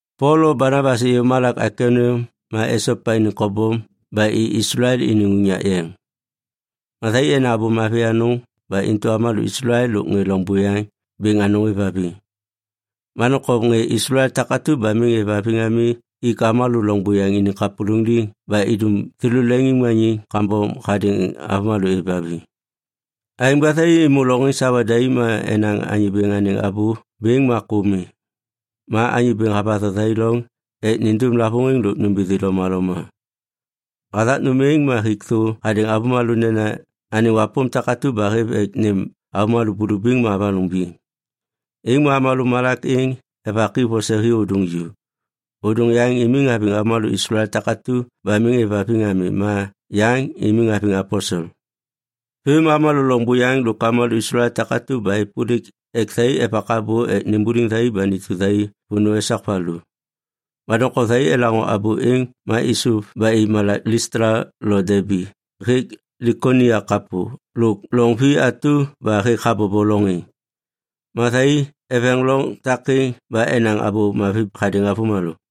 Pol lo Banabas êyô malak Aikoniam ma esopa iniŋ kobom ba i Islael iniŋ unyak yeŋ. Ma thai enaŋ abô mavi anôŋ ba intu avômalô Islael lôk ŋê loŋ buyaŋ bêŋ anôŋ êvhaviŋ. Ma doŋtom ŋê Islael takatu ba miŋ êvhaviŋ ami ik avômalô loŋ buyaŋ iniŋ kapôlôŋiŋ liŋ ba idum thêlô leŋiŋmaniŋ kambom hadêŋ avômalô êvhaviŋ. Aêŋ ba thai êmô loŋ êŋ sawa daim ma enaŋ Anyô Bêŋ anêŋ abô bêŋ ma kô mi. Ma Anyô Bêŋ havatho thai loŋ ek nindum lavôŋiŋ lôk nômbithi lomaloma. Hathak nôm êŋ ma hik thô hadêŋ avômalô nena anêŋ wapôm takatu ba hêv ek nêm avômalô bulubiŋ ma avanôŋ biŋ. Êŋ ma avômalô malak êŋ evak i vose hi ôdôŋ ju. Ôdôŋ yaŋ imiŋ haviŋ avômalô Islael takatu ba miŋ êvhaviŋ ami ma yaŋ imiŋ haviŋ aposel. Vêm ma avômalô loŋ buyaŋ lôk avômalô Islael takatu ba êpôlik ek thai evak abô ek nimbuliŋ thai ba nitu thai vônô esak valu. Ma doŋtom thai elaŋô abô êŋ ma êsôv ba i malak Listla lo Debi hêk Likonia kapô lôk loŋ vi atu ba hêk habobo loŋ êŋ. Ma thai eveŋ loŋ takêŋ ba enaŋ Abô Mavi hadêŋ avômalô.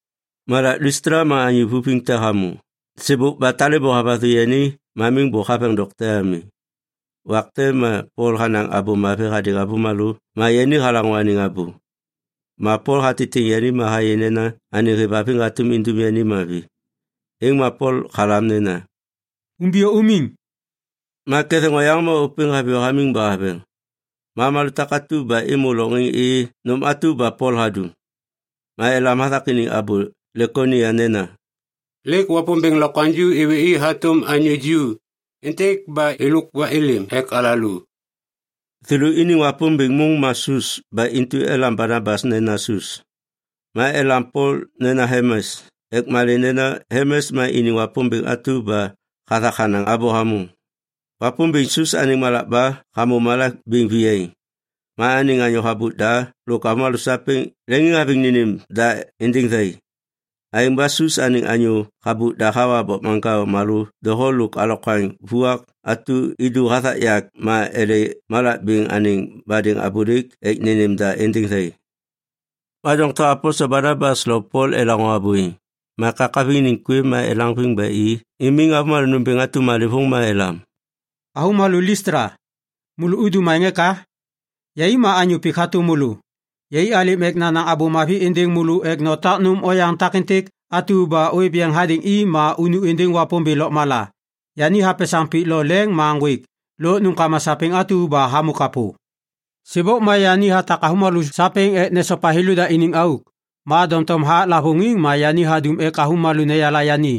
Malak Listla ma anyô vavuviŋ te hamô. Sêbôk ba talêbô havathu yani ma miŋ bôk haveŋ dokte ami. Wak te ma Pol hanaŋ Abô Mavi hadêŋ avômalô ma yani halaŋô anêŋ abô. Ma Pol hatitiŋ yani ma hayê nena anêŋ hêvhaviŋ hatôm indum yani mavi. Êŋ ma Pol halam nena, “Umbiyô umiŋ.” Ma ketheŋ oyaŋ ma ôpêŋ haviyô hamiŋ ba haveŋ. Ma avômalô takatu ba êmô loŋ êŋ êyê nôm atu ba Pol hadum. Ma elam hathak iniŋ abô Likonia nena, “Lêk wapômbêŋ lokwaŋju êwê i hatôm anyô ju êntêk ba êlôk ba êlêm ek alalô!” Thêlô iniŋ wapômbêŋ môŋ ma Sus ba intu elam Banabas nena Sus. Ma elam Pol nena Helmes ek malê nena Helmes ma iniŋ wapômbêŋ atu ba hathak hanaŋ abô hamôŋ. Wapômbêŋ Sus anêŋ malakba hamô malak bêŋ viyaiŋ. Ma anêŋ anyô habôk da lôk avômalô sapêŋ leŋiŋhaviŋ nênêm da êndêŋ thai. Aêŋ ba Sus anêŋ anyô habôk da hawa bokmaŋkao malô doho lôk alokwaŋ vuak atu idu hathak yak ma ele malak bêŋ anêŋ badêŋ abôlêk ek nênêm da êndêŋ thai. Ma doŋtom aposel Banabas lo Pol elaŋô abô êŋ, ma ekakaviŋ iniŋ kwêv ma elaŋviŋ ba i imiŋ avômalô nômbêŋ atu malêvôŋ ma elam, “Avômalô Listla! Môlô udum aêŋ eka? Yai ma anyô pik hatôm môlô. Yai alêm ek nanaŋ Abô Mavi êndêŋ môlô ek notak nôm oyaŋ takêntêk atu ba ôêv yeŋ hadêŋ i ma unu êndêŋ Wapômbêŋ lôkmala. Yani hapesaŋ pik lo leŋ ma ŋgwêk lôk nômkama sapêŋ atu ba hamô kapô. Sêbôk ma yani hatak avômalô sapêŋ ek nesopa thêlôda iniŋ auk. Ma doŋtom hathak lavôŋiŋ ma yani hadum ek avômalô neyala yani.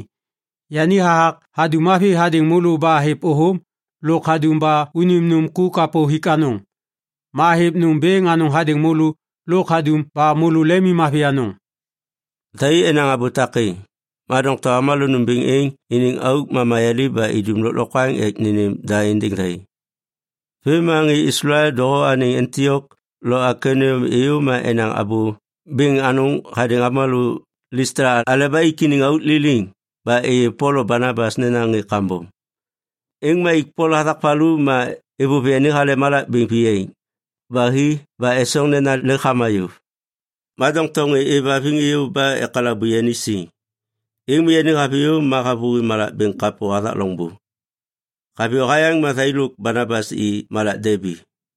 Yani hathak hadum mavi hadêŋ môlô ba hêv ôthôm lôk hadum ba unim nôm ku kapô hik anôŋ. Ma hêv nôm bêŋ anôŋ hadêŋ môlô lôk hadum ba môlô lemimmavi anôŋ.” Thai enaŋ abô takêŋ, ma doŋtom avômalô nômbêŋ êŋ iniŋ auk ma mayaliv ba idum lôklokwaŋ ek nênêm da êndêŋ thai. Vêm ma ŋê Islael doho anêŋ Antiok lo Aikoniam êyô ma enaŋ abô bêŋ anôŋ hadêŋ avômalô Listla aleba ik iniŋ auk liliŋ ba êyê Pol lo Banabas nena ŋê kambom. Êŋ ma ik Pol hathak valu ma êvôv yani hale malak bêŋ viyaiŋ ba hi ba esoŋ nena lêk hama yôv. Ma doŋtom ŋê êvhaviŋ êyô ba ekalabu yani siŋ, êŋ ma yani haviyô ma havôhi malak bêŋ kapô hathak loŋbô. Haviyô hayaŋ ma thai lôk Banabas i malak Debi.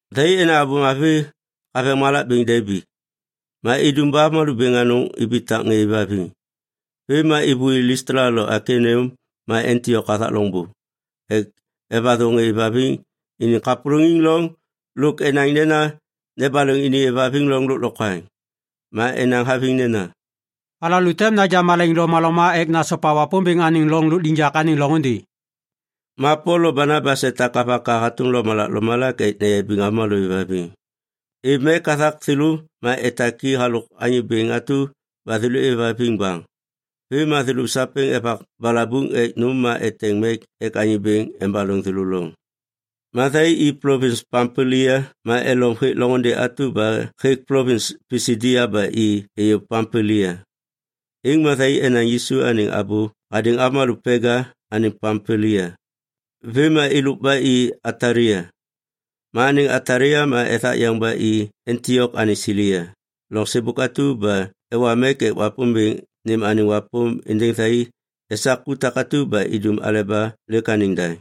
Thai enaŋ Abô Mavi haveŋ malak bêŋ Debi. Ma idum ba avômalô bêŋ anôŋ ibitak ŋê êvhaviŋ. Vêm ma êvôi Listla lôk Aikoniam ma Antiok hathak loŋbô ek evatho ŋê êvhaviŋ iniŋ kapôlôŋiŋ loŋ lôk enaŋ nena nebaloŋ iniŋ êvhaviŋ loŋ lôklokwaŋ. Ma enaŋ haviŋ nena, “Alalô tem naja malaiŋ lomaloma ek nasopa Wapômbêŋ anêŋ loŋ lôkliŋyak anêŋ loŋôndê.” Ma Pol lo Banabas etak avaka hatôm lomalak lomalak ek neyabiŋ avômalô êvhaviŋ. Êv mek hathak thêlô ma etak i halôk Anyô Bêŋ atu ba thêlô êvhaviŋ baŋ. Vêm ma thêlô sapêŋ evak balabuŋ ek nôm ma eteŋ mek ek Anyô Bêŋ embaloŋ thêlô loŋ. Ma thai i plovins Pampilia ma elom hêk loŋôndê atu hêk plovins Pisidia ba i êyô Pampilia. Êŋ ma thai enaŋ Yisu anêŋ abô hadêŋ avômalô Pega anêŋ Pampilia. Vêm ma êlôk ba i Atalia. Ma anêŋ Atalia ma ethak yeŋ ba i Antiok anêŋ Silia, loŋ sêbôk atu ba ewa mek ek Wapômbêŋ nêm anêŋ wapôm êndêŋ thai esak ku takatu ba idum aleba lêk anêŋ daŋ.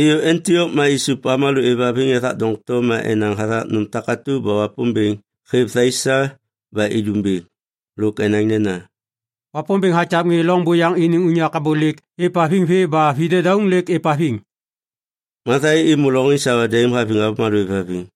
Êyô Antiok ma isup avômalô êvhaviŋ ethak doŋtom ma enaŋ hathak nôm takatu ba Wapômbêŋ hêv thai sa ba idum bêŋ. Lôk enaŋ nena, “Wapômbêŋ hakyav ŋê loŋ buyaŋ iniŋ unyak abôlêk êvhaviŋ vê ba vi dedauŋ lêk êvhaviŋ.” Ma thai êmô loŋ êŋ sawa daim haviŋ avômalô êvhaviŋ.